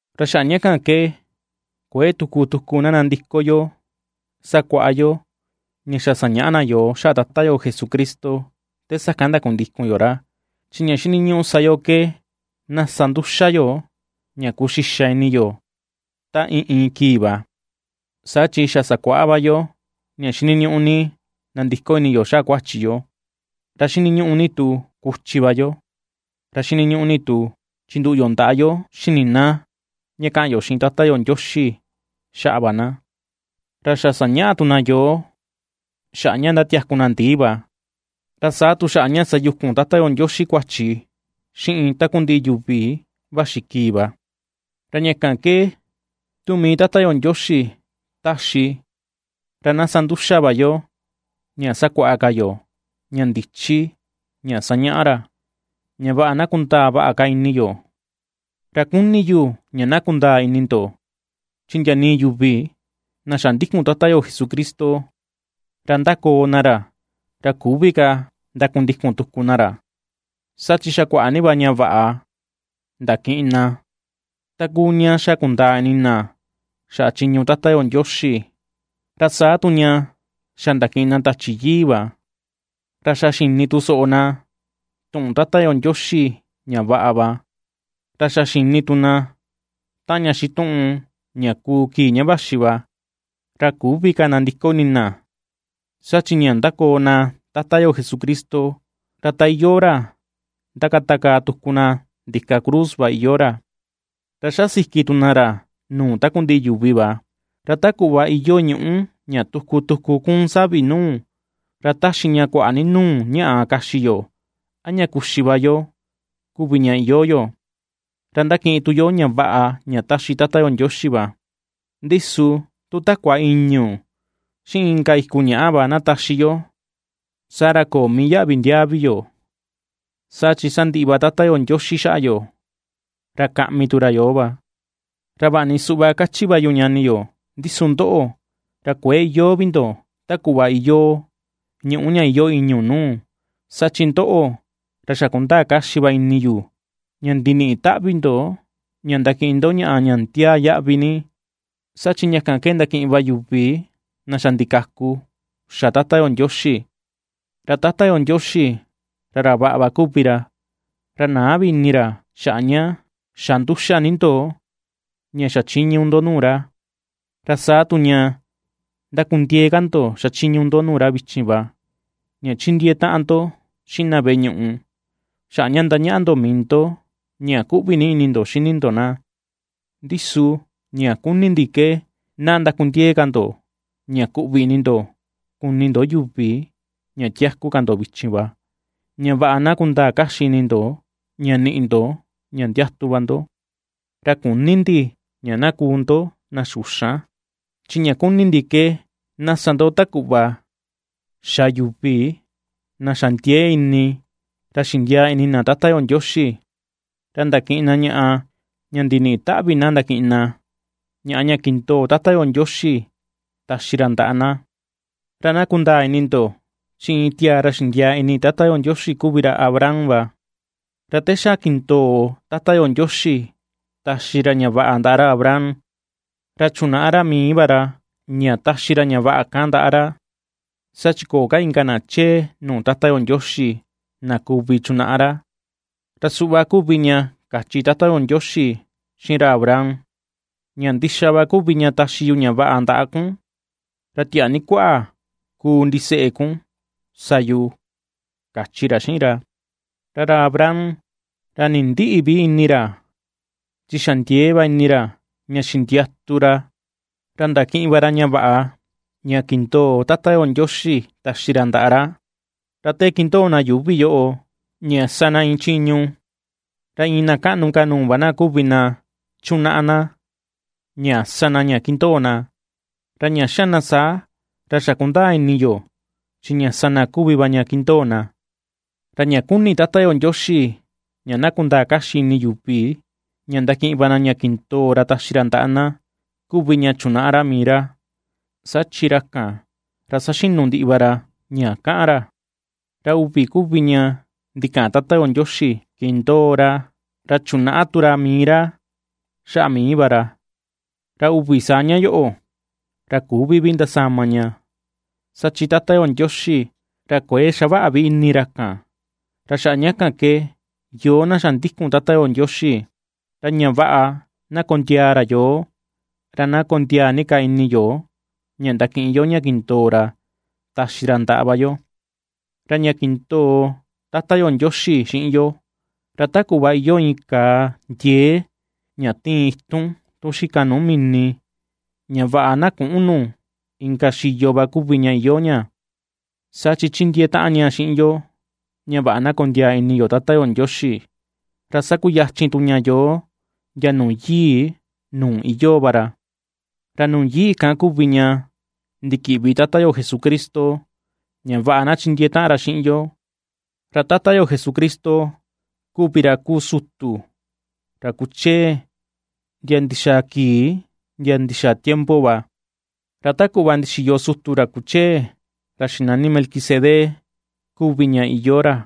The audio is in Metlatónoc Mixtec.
Ra xaꞌa ña kan ke kuëe tuku tuku na nandiko yo sakuaꞌa yo ña xa sañaꞌa na yoo xaꞌa Tata yo Jesucristo te sakan ndakundikun yo ra. Chi ña xiniñuꞌu sa yo ke na sa nduxa yo ña kuxixa ini yo ta iin iin kii va, saa chi xa sakuaꞌa va yo ña xiniñuꞌu ni nandiko ini yo xaꞌa kuachi yo, ra xiniñuꞌu ni tu kuchi va yo, ra xiniñuꞌu ni tu chinduꞌu yo ndaꞌa yo xini na ña kaꞌan yo xiꞌin Tata yo Ndioxi xaꞌa va na; ra xa sañaꞌa tu na yoo xaꞌa ña ndatiaku na ndii va, ra saa tu xaꞌa ña sayukun Tata yo Ndioxi kuachi xiꞌin takundiꞌi yuvi vaxi kii va. Ra ña kan ke tu mii Tata yo Ndioxi taxi, ra na sa nduxa va yo ña sakuaꞌa ka yo ña ndichi ña sañaꞌa ra, ña vaꞌa na kundaa vaꞌa ka ini yo. Ra kuni yu ña na kundaa ini ndo, chi ndia nii yuvi na xa ndikun Tata yo Jesucristo ra ^ndakoo na ra, ra küvi ka ndakundikun tuku na ra, saa chi xa kuaꞌa ni va ña vaꞌa ndakiꞌin na: ta kuu ña xa kundaa ini na xaꞌa chiñu Tata yo Ndioxi, ra saa tu ña xa ndakiꞌin na Tachi Yii va. Ra xa xini tu soꞌo na tuꞌun Tata yo Ndioxi ña vaꞌa va, ra xa xini tu na taꞌan ña xituꞌun ña kuu kii ña vaxi va. Ra ^küvi ka nandiko ini na, saa chi ña ^ndakoo na Tata yo Jesucristo, ra ta iyoo ra ^ndakatakaa tuku na ndika cruz va iyoo ra, ra ^xa siki tu na ra nuu takundiꞌi yuvi va. Ra ta kuꞌva iyoo ñuꞌú ña tuku tuku kuun savi nuu, ra taxi ña kuaꞌa ni nuu ñaꞌa kaxi yo a ña kuxi va yo kuvi ña iyoo yo, ra ndakiꞌin tu yo ña vaꞌa ña taxi Tata yo Ndioxi va. Ndi su tu takua ìñu̱, xiꞌin inka iku ñaꞌa va na taxi yo, saa ra köo mii yaꞌvi ndiaa vi yo, saa chi sandiꞌi va Tata yo Ndioxi xaꞌa yo, ra kaꞌmi tu ra yoo va. Ra vaꞌa ni suꞌva ^kachi va yu ñani yo, ndi su ndoꞌo, ra kuëe iyoo vi ndo ta kuꞌva iyoo ñuꞌú ña iyoo ìñu̱ nuu, saa chi ndoꞌo, ra xa kundaa kaxi va ini yu ña ndiniꞌi taꞌvi ndo ña ndakiꞌin ndo ñaꞌa ña ndiaa yaꞌvi ni, saa chi ña kan ke ndakiꞌin va yuvi na xa ndikaku xa Tata yo Ndioxi. Ra Tata yo Ndioxi, ra ra vaꞌa va kuvi ra; ra näa vi ini ra xaꞌa ña xa nduxa ni ndo ña xachiñu ndo nuu ra, ra saa tu ña ^ndakundiee ka ndo xachiñu ndo nuu ra vichin va, ña ^chindiee taꞌan ndo xiꞌin na veꞌe ñuꞌu, xaꞌa ña ^ndañaꞌa ndo mii ndo ña kuꞌvi ni ini ndo xini ndo na. Ndi su ña ^kuni ndi ke na ndakundiee ka ndo, ña kuꞌvi ini ndo kuni ndo yuvi ña tiaku ka ndo vichin va, ña vaꞌa na kundaa kaxi ini ndo ña niꞌi ndo ña ndiatu va ndo. Ra küni ndi ña na kuu ndo na xuxan, chi ña kuni ndi ke na sa ndo ta kuꞌva xa yuvi na xa ndiee ini ra xindiaa ini na Tata yo Ndioxi, ra ndakiꞌin na ñaꞌa ña ndiniꞌi taꞌvi na ndakiꞌin na, ñaꞌa ña kindoo Tata yo Ndioxi taxi ra ndaꞌa na. Ra na kundaa ini ndo, chi iin tiaa ra xindiaa ini Tata yo Ndioxi kuvi ra Abraham va. Ra te xa kindoo Tata yo Ndioxi taxi ra ña vaꞌa ndaꞌa ra Abraham, ra chunaꞌa ra mii va ra ña taxi ra ña vaꞌa kan ndaꞌa ra, saa chi köo ka inka na chee nuu Tata yo Ndioxi na kuvi chunaꞌa ra. Ra suꞌva kuvi ña kachi Tata yo Ndioxi xiꞌin ra Abraham: “Ña ndixa va kuvi ña taxi yu ña vaꞌa ndaꞌa kun, ra tiaa ni kuaꞌa kuu ndiseꞌe kun sa yu”, kachi ra xiꞌin ra. Ra ra Abraham ra nindïꞌi vi ini ra, chi xa ndiee va ini ra, ña xindiatu ra, ra ndakiꞌin va ra ña vaꞌa ña kindoo Tata yo Ndioxi taxi ra ndaꞌa ra. Ra te ^kindoo na yuuvi yoꞌo, ña sa na iin chiñu, ra iin na kaꞌnu ka nuu va na kuvi na chunaꞌa na ña sa na ña kindoo na, ra ña xa na saa, ra xa kundaa ini yo chi ña sa na kuvi va ña ^kindoo na. Ra ña ^kuni Tata yo Ndioxi ña na kundaa kaxi ini yuvi ña ndakiꞌin va na ña kindoo ra taxi ra ndaꞌa na, kuvi ña chunaꞌa ra mii ra, saa chi ra kan, ra saxinu ndiꞌi va ra ña kaꞌan ra. Ra uvi kuvi ña ndikaꞌan Tata yo Ndioxi kindoo ra, ra chunaꞌa tu ra mii ra xaꞌa mii va ra, ra uvi saa ña yoꞌo, ra küvi vi ndasama ña, saa chi Tata yo Ndioxi ra kuëe xavaꞌa vi ini ra kan. Ra xaꞌa ña kan ke, yoo na xa ndikun Tata yo Ndioxi, ra ña vaꞌa na kondiaa ra yoo, ra na kondiaa ni ka ini yo ña ndakiꞌin yo ña kindoo ra taxi ra ndaꞌa va yo. Ra ña kindoo Tata yo Ndioxi xiꞌin yo, ra ta kuꞌva iyoo iin kàà ndiee ña tiin itun tun xika nuu mini ña vaꞌa na küꞌun nu inka xiyo va kuvi ña iyoo ña, saa chi ^chindiee taꞌan ña xiꞌin yo ña vaꞌa na kondiaa ini yo Tata yo Ndioxi, ra ^sakuyachin tu ña yoo ndia nuu yii nuu iyoo va ra. Ra nuu yii kan kuvi ña ndikiꞌvi Tata yo Jesucristo, ña vaꞌa na chindiee taꞌan ra xiꞌin yo. Ra Tata yo Jesucristo kuvi ra kuu sutu ra kuchee ndia ndixaa kii ndia ndixaa tiempo va, ra ta kuꞌva ndixiyo sutu ra kuchee, ra xinani Melquisedec kuvi ña iyoo ra.